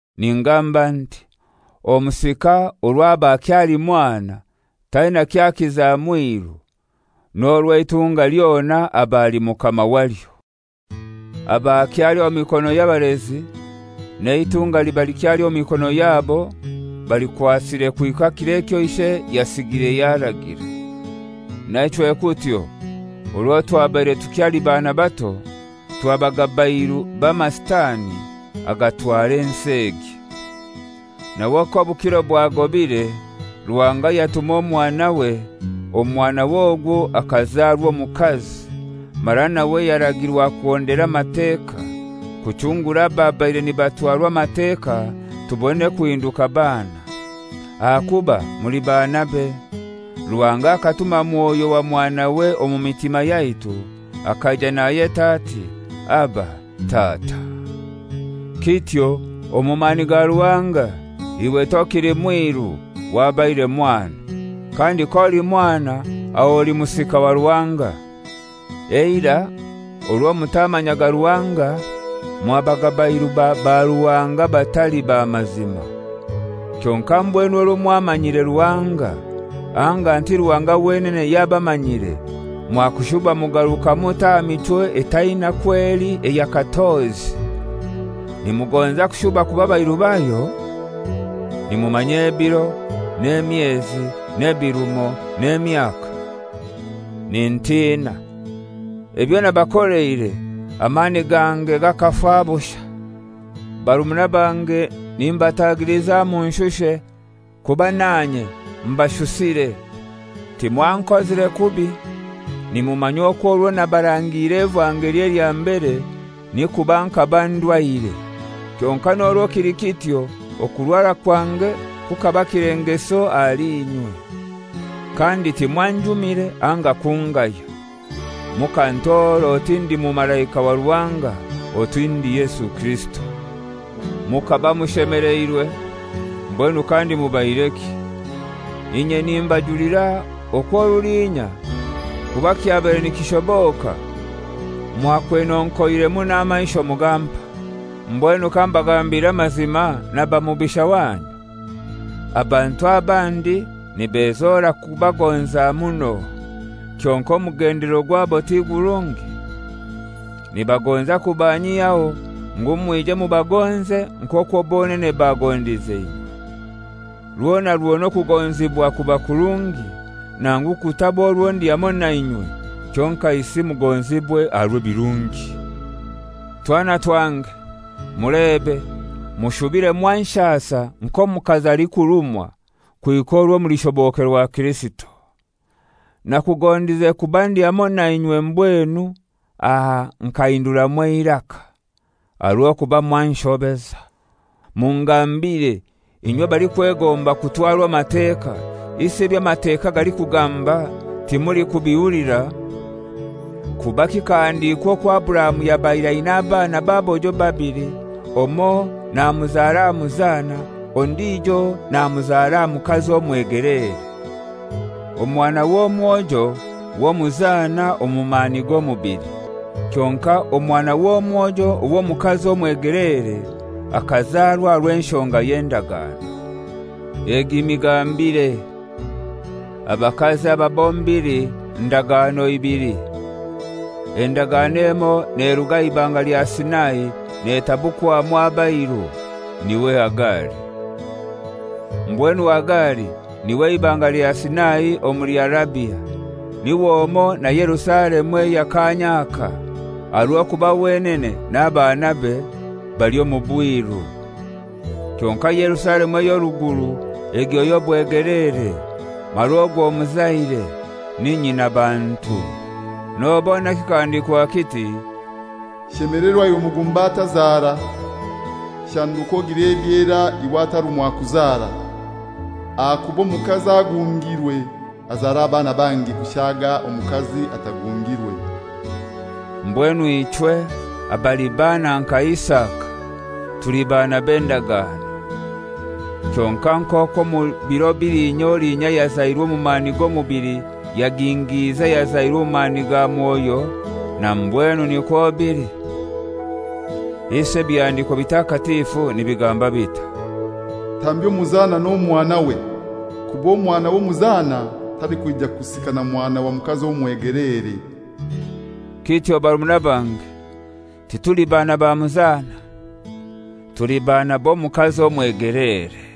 Ningamba nti: Omusika orwo aba akyali mwana taina ky'akiza mwiru, n'orwo eitunga lyona aba ali mukama walyo. Aba akyali omu mikono y'abalezi, n'eitunga liba likyali omu mikono yabo balikwasire kuhika kiro ekyo ishe yasigire yaragira. Naichwe kutyo, orwo twabaire tukyali baana bato twabaga bairu b'amasitani agatwara ensi egi. Nawe k'obukiro bwagobire Ruhanga yatuma Omwanawe, Omwanawe ogwo akazarwa omukazi, mara nawe yaragirwa kuhondera Amateka, kuchungura ababaire nibatwarwa Amateka tubone kuhinduka baana. Ahakuba muli baanabe. Ruhanga akatuma Mwoyo wa Mwanawe omu mitima yaitu, akaija nayeta ati, «Aba! Tata!» Kityo omu mani ga Ruhanga iwe tokili mwiru, wabaire mwana, kandi k'oli mwana aho oli musika wa Ruhanga. Eirai orwo mutamanyaga Ruhanga mwabaga bairu ba baruhanga abatali ba mazima. Kyonkai mbwenu orwo mwamanyire Ruhanga, anga nti Ruhanga wenene yabamanyire, mwakushuba mugaruka mutai aha michwo etaina kwo eli eya katozi? Nimugonza kushuba kuba bairu bayo? Nimumanya ebiro, n'emyezi, n'ebirumo, n'emyaka! Nintina, ebyo nabakoleire amani gange gakafa bushai. Barumuna bange, nimbatagiliza munshushe, kuba nanye mbashusiire. Timwankozire kubi. Nimumanya okwo orwo nabarangiire evangeli elya mbere ni kuba nkaba ndwaire. Kyonkai n'orwo kili kityo okurwara kwange kukaba kilengeso ahali inywe. Kandi timwanjumire anga kungaya. Mukantora oti ndi mumalaika wa Ruhanga, oti ndi Yesu Kirisito. Mukaba mushemeleirwe! Mbwenu kandi mubaireki? Inye nimbajulira okwo rulinya, kuba kyabaire nikishoboka, mwakwenonkoiremu n'amaisho mugampa. Mbwenu kambagambire amazima naba mubisha wanyu? Abantu abandi nibezora kubagonza muno, kyonkai omugendelero gwabo ti gurungi. Nibagonza kubanyihyaho, ngu mwije mubagonze nk'okwo bonene bagondize inywe. Rwona rwona okugonzibwa kuba kurungi, nangu kutaba orwo ndi hamoi nainywe, kyonkaisi mugonzibwe aha rw'ebirungi. Twana twange, mulebe mushubire mwanshasa nk'omukazi alikurumwa kuhika orwo mulishobokerwa Kirisito. Nakugondize kuba ndi hamoi nainywe mbwenu aha nkahinduramu eiraka, aha rw'okuba mwanshobeza. Mungambire inywe abalikwegomba kutwarwa Amateka, isi ebyo Amateka galikugamba timulikubihulira? Kuba kikahandikwa okwo Aburahamu yabaire aina abaana b'abojo babili, omoi namuzara aha muzana, ondijo namuzara aha mukazi omwegeleere. Omwana w'obwojo w'omuzana omu mani g'omubili. Kyonkai omwana w'obwojo ow'omukazi omwegelere akazarwa aha rw'enshonga y'endagano. Egi migambire: Abakazi aba bombili ndagano ibili. Endagano emoi neruga aha Ibanga lya Sinai, netabukwamu abairu; niwe Hagari. Mbwenu Hagari niwe Ibanga lya Sina omuli Arabia, niwe omoi na Yerusalemu eya kanya aka, aha rw'okuba wenene n'abaanabe bali omu bwiru. Kyonkai Yerusalemu ey'oruguru egyo y'obwegeleere, mara ogwo muzaire, ni nyinabantu. Nobona kikahandikwa kiti, «Shemelerwa iwe mugumba atazara; shanduka ogire ebyera iwe atarumwa kuzara; ahakuba omukazi agungirwe azara abaana bangi kushaga omukazi atagungirwe.» Mbwenu ichwe abali baana nka Isaka, tuli baana b'endagano. Kyonkai nk'okwo omu biro bilinya olinya ayazairwe omu mani g'omubili yagingiize ayazairwe omu mani ga Mwoyo, na mbwenu nikwo bili. Isi Ebihandiko Bitakatifu nibigamba bitai? «Tambya omuzana n'omwanawe, kuba omwana w'omuzana talikwija kusika na mwana wa mukazi omwegeleere.» Kityo barumuna bange, tituli baana ba muzana; tuli baana b'omukazi omwegeleere.